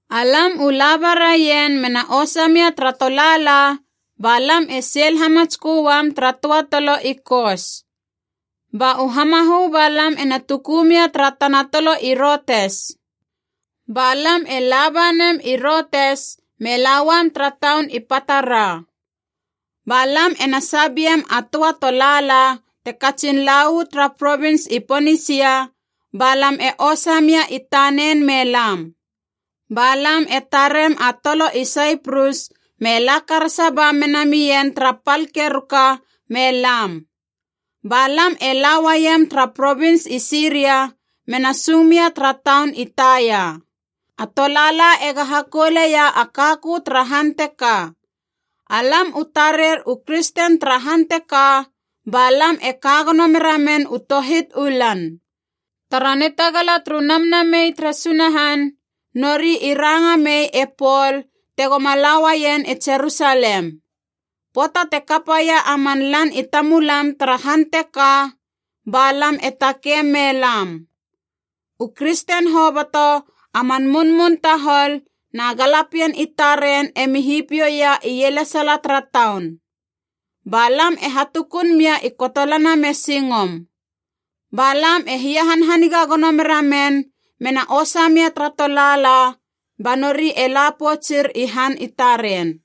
Alam u laba raien mena osa mia tara tolaala ba lam e seil hamatskö uam tara töa tolo i Kos. Ba u hamahö ba lam ena tuku mia tara tana tolo i Routes. Ba lam e laba nem i Routes me la uam tara taun i Patara. Ba lam ena sabeiem a töa tolaala te katsin la uu tara provins i Ponisia, ba lam e osa mia i tanen me lam. Ba lam e tarem a tolo i Saiprus me la karasa ba mena mien tara pal keruka me lam. Ba lam e la uaiem tara provins i Siria mena sung mia tara taun i Taia. A tolaala ega hakouleia a kakö tara han teka. Alam u tarer u kristen tara han teka, ba lam e ka gono mera men u tohit u lan. Tara nitagala turu Namnamei tere Sunahan nori i ranga mei e Pol tegoma la uaien i Jerusalem. Pöata te kapaia a man lan i tamulam tara han teka, ba lam e takeim me lam. U kristen hoboto, a man munmun tahol na galapien i taren emi hipiouia ielesala tara taun. Ba lam e hatukun mia i kotolana me singom. Ba lam e hiahanhaniga gono mera men, mena osa mia tara tolaala, ba nori e la poutsur i han i taren.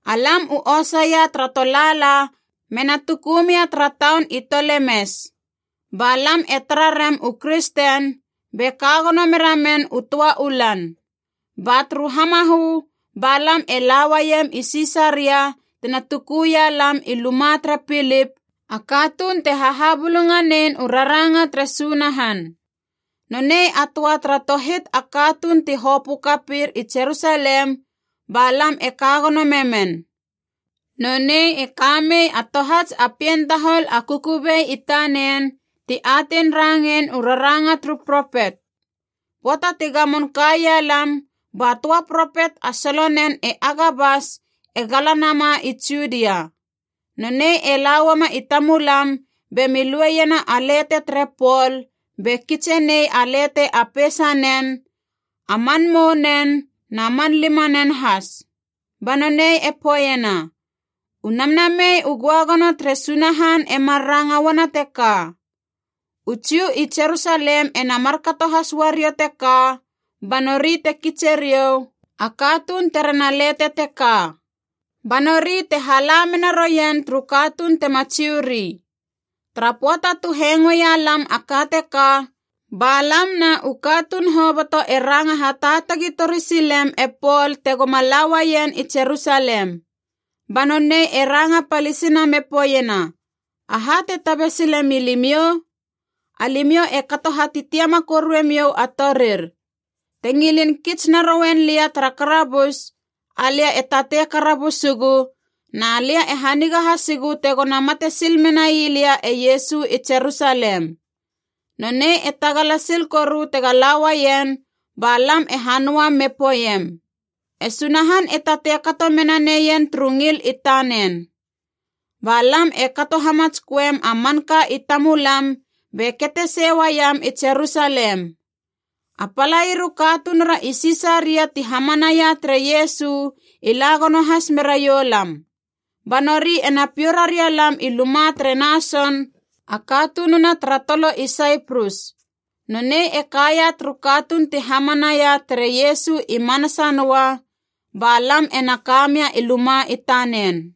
Alam u osaia tara tolaala mena tuku mia tara taun i Tolemes. Ba lam e tara rem u kristen, be ka gono mera men u töa u lan. Ba turu hamahö ba lam e la uaiem i Sisaria tina tuku ia lam i luma tere Pilip, a katuun te hahabulunganein u raranga tere Sunahan. Nonei a töa tara tohit a katuun ti hopö kapir i Jerusalem ba lam e ka gono memen. Nonei e ka mei a tohats a pien tahol a kukubei i tanen ti atein rangein u raranga turu propet. Pöata ti gamon kaia lam, ba töa propet a solonen e Agabas e gala nama i Judia. Nonei e la uama i tamulam be mi lueiena a lete tere Pol, be kitse nei a lete a peisanen, a man mounen na man limanen has. Ba nonei e poeiena, “U Namnamei u Göagono tere Sunahan e mar ranga uana teka, ‘U Jiu i Jerusalem ena markato has uariou teka ba nori te kitseriou a katuun terena lete teka. Ba nori te hala mena rouien turu katuun tema Jiu ri.’” Tara pöata tu hengoeia lam a ka teka, ba lam na u katuun hoboto e ranga hataatagi tori silem e Pol tegoma la uaien i Jerusalem. Ba nonei e ranga palisina me poeiena, “Aha te tabe sile milimiou? Alimiou e kato hatitiama koruemiou a torir. Te ngilin kits narouen lia tara karabus, alia e tatei karabusugu, na lia e haniga hasigu tegona mate sil menai lia e Iesu i Jerusalem.” Nonei e tagala sil koru tega la uaien ba lam e hanöam me poeiem, “E Sunahan e tatei kato mena neien turu ngil i tanen.” Ba lam e kato hamatsköem a manka i tamulam be kete sei uaiam i Jerusalem. A palair u katunura i Sisaria ti hamanaia tere Iesu i la gono has meraiou lam. Ba nori ena piou raria lam i luma tere Nason, a katununa tara tolo i Saiprus. Nonei e kaia turu katuun ti hamanaia tere Iesu i manasa noa, ba lam ena ka mia i luma i tanen.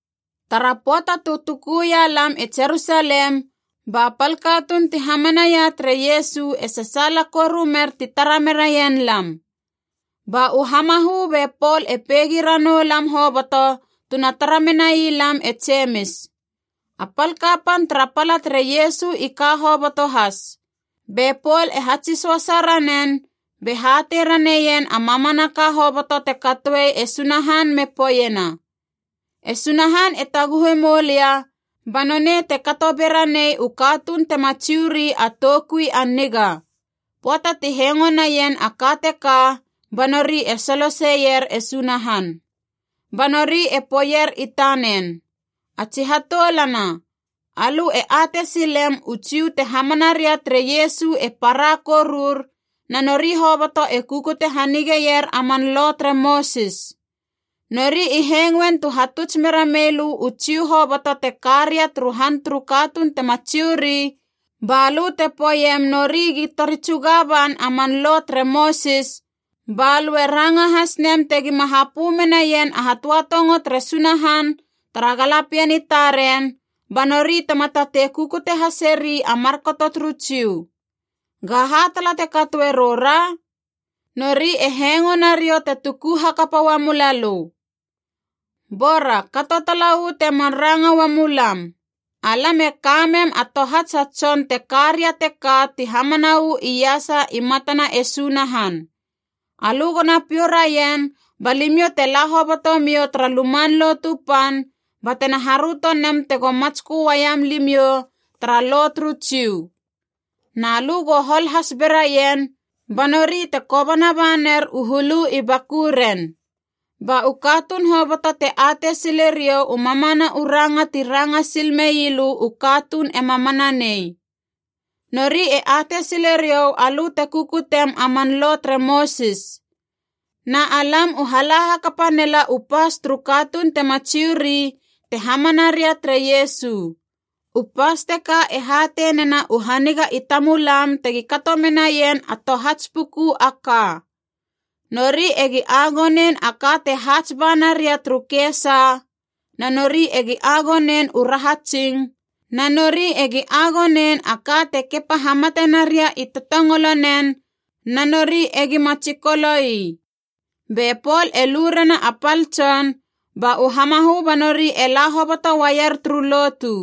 Tara pöata tu tukuia lam i Jerusalem ba pal katuun ti hamanaia tere Iesu e sasaala koru mer ti tara meraien lam. Ba u hamahö be Pol e peigi ranou lam hoboto tuna tara menai lam e Jemis. A pal kapan tara pala tere Iesu i ka hoboto has. Be Pol e hatsi söasa ranen, be hatei raneien a mamanaka hoboto te katoe e Sunahan me poeiena, “E Sunahan e taguhe moulia ba nonei te kato be ranei u katuun tema Jiu ri a toukui a niga.” Pöata ti hengo naien a ka teka, ba nori e soloseier e Sunahan. Ba nori e poeier i tanen, “A tsi hatoulana, alö e atei silem u Jiu te hamana ria tere Iesu e para korur na nori hoboto e kukute hanigeier a man Lo tere Mosis. Nori i hengoen tu hatuts mera mei lö u Jiu hoboto te ka ria turu han turu katuun tema Jiu ri ba lö te poeiem nori gi tori tsuga ban a man Lo tere Mosis, ba lö e ranga has nem tegima hapö menaien a hatöatongo tere Sunahan tara galapien i taren, ba nori tema tatei kukute haseri a markato turu Jiu. Gaha tala te katoe roura? Nori e hengo na riou te tuku hakapa uamula lö. “Bora kato tala uu temar ranga uamulam. Alam e ka mem a tohats a tson te ka ria teka ti hamana uu iasa i matana e Sunahan. Alö gona piou raien ba limiou te la hobotomiou tara Luman Lotu Pan batena haröto nem tego matskö uaiam limiou tara Lo turu Jiu. Na lö go hol has beraien, ba nori te kobana ba ner u hulu i bakuren. Ba u katuun hoboto te atei sile riou u mamana u ranga ti ranga sil mei lö u katuun ema mana nei. Nori e atei sile riou alö te kukutem a man Lo tere Mosis. Na alam u hala hakapa nela u pas turu katuun tema Jiu ri te hamana ria tere Iesu. U pas teka e hatei nena u haniga i tamulam tegi kato menaien a tohats puku a ka: nori egi agonein a ka te haats ba naria turu kesa, na nori egi agonein u rahatsing, na nori egi agonein a ka te kepa hamate naria i totongolonen na nori egi ma tsikolo ii.” Be Pol e lu rena a pal tson, ba u hamahö ba nori e la hoboto uaier turu lotu.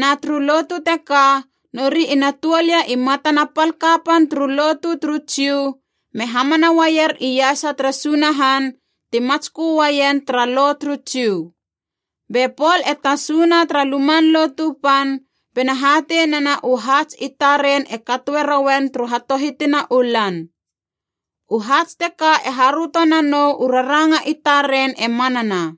Na turu lotu teka nori ina tuol ia i matana pal kapan turu lotu turu Jiu me hamana uaier iasa tere Sunahan ti matskö uaien tara Lo turu Jiu. Be Pol e tasuna tara Luman Lotu Pan bena hatei nena u haats i taren e katoe rouen turu hatohitina u lan. U haats teka e haröto nanou u raranga i taren e manana.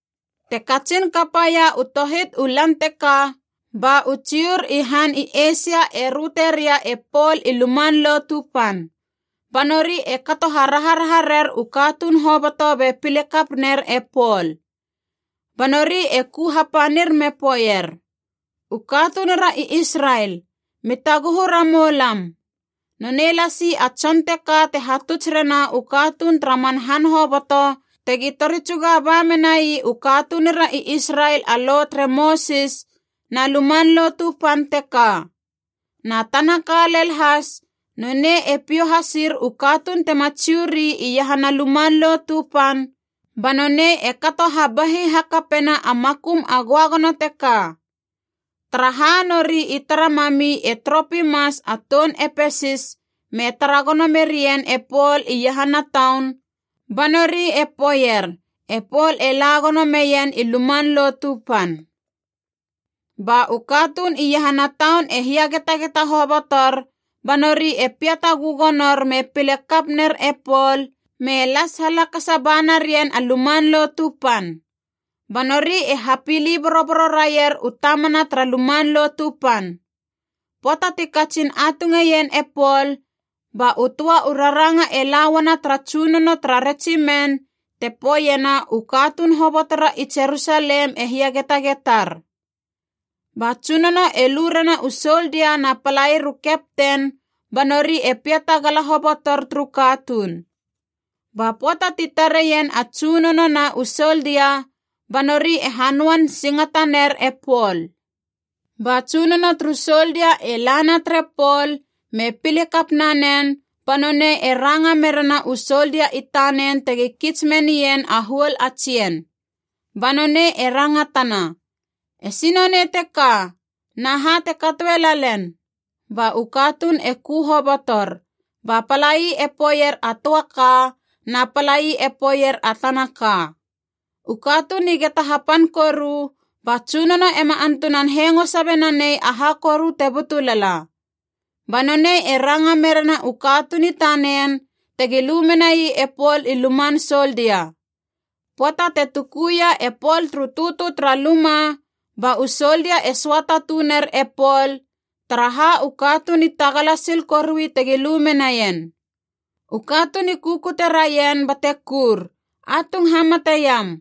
Te katsin kapaia u tohit u lan teka, ba u Jiur i han i Eisia e röte ria e Pol i Luman Lotu Pan. Ba nori e kato haraharaha rer u katuun hoboto be pile kap ner e Pol. Ba nori e ku hapanir me poeier, “U katunura i Israel, mi taguhu ramou lam! Nonei lasi a tson teka te hatuts rena u katuun tara man han hoboto tegi tori tsuga ba menai u katunura i Israel a Lo tere Mosis na Luman Lotu Pan teka. Na tana ka lel has, nonei e piou hasir u katuun tema Jiu ri iahana Luman Lotu Pan ba nonei e kato habahi hakapena a makum a Göagono teka!” Taraha nori i tara mami e Tropimas a toun Epesis me tara gono merien e Pol iahana taun, ba nori i poeier e Pol e la gono meien i Luman Lotu Pan. Ba u katuun iahana taun e hiagetageta hobotor, ba nori e piata gögonor me pile kap ner e Pol me las halakasa ba narien a Luman Lotu Pan. Ba nori e hapili boroboro raier u tamana tara Luman Lotu Pan. Pöata ti katsin atungeien e Pol, ba u töa u raranga e la uana tara tsunono tara Retsimen te poeiena u katuun hobotora i Jerusalem e hiagetagetar. Ba tsunono e lu rena u soldia na palair u kepten ba nori e piata gala hobotor turu katuun. Ba pöata ti tareien a tsunono na u soldia, ba nori e hanöan singata ner e Pol. Ba tsunono turu soldia e lana tere Pol me pile kap nanen ba nonei e ranga merena u soldia i tanen tegi kits menien a huol a tsien. Ba nonei e rangatana, “Esi nonei teka, na ha te katoe lalen?” Ba u katuun e ku hobotor, ba palai e poeier a töa ka na palai e poeier a tana ka. U katuun i geta hapan koru, ba tsunono ema antunan hengo sabe nanei aha koru te butu lala. Ba nonei e ranga merena u katuun i tanen tegi lu menai e Pol i luman soldia. Pöata te tukuia e Pol turu tötö tara luma ba u soldia e söata tuner e Pol, taraha u katuun i tagala sil korui tegi lu menaien. U katuun i kukute raien bate kur, “Atung hamate iam!”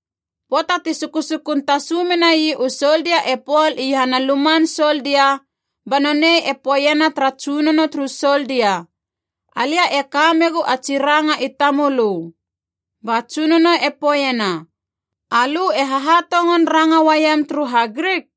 Pöata ti sukusukun tasu menai u soldia e Pol iahana luman soldia, ba nonei e poeiena tara tsunono turu soldia, “Alia e ka megu a tsi ranga i tamölö.” Ba tsunono e poeiena, “Alö e hahatongon ranga uaiem turu HaGrik?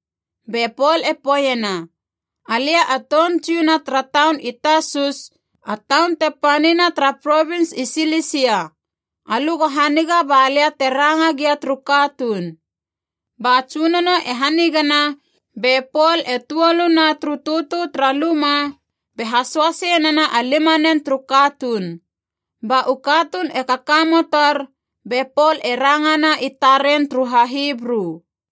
Be Pol e poeiena, “Alia a toun Jiu na tara taun i Tasus, a taun te panina tara provins i Silisia. Alö go haniga ba lia te ranga gia turu katuun.” Ba tsunono e hanigana be Pol e tuoluna turu tötö tara luma be hasoasei nena a limanen turu katuun. Ba u katuun e kakamotor be Pol e rangana i taren turu HaHibru.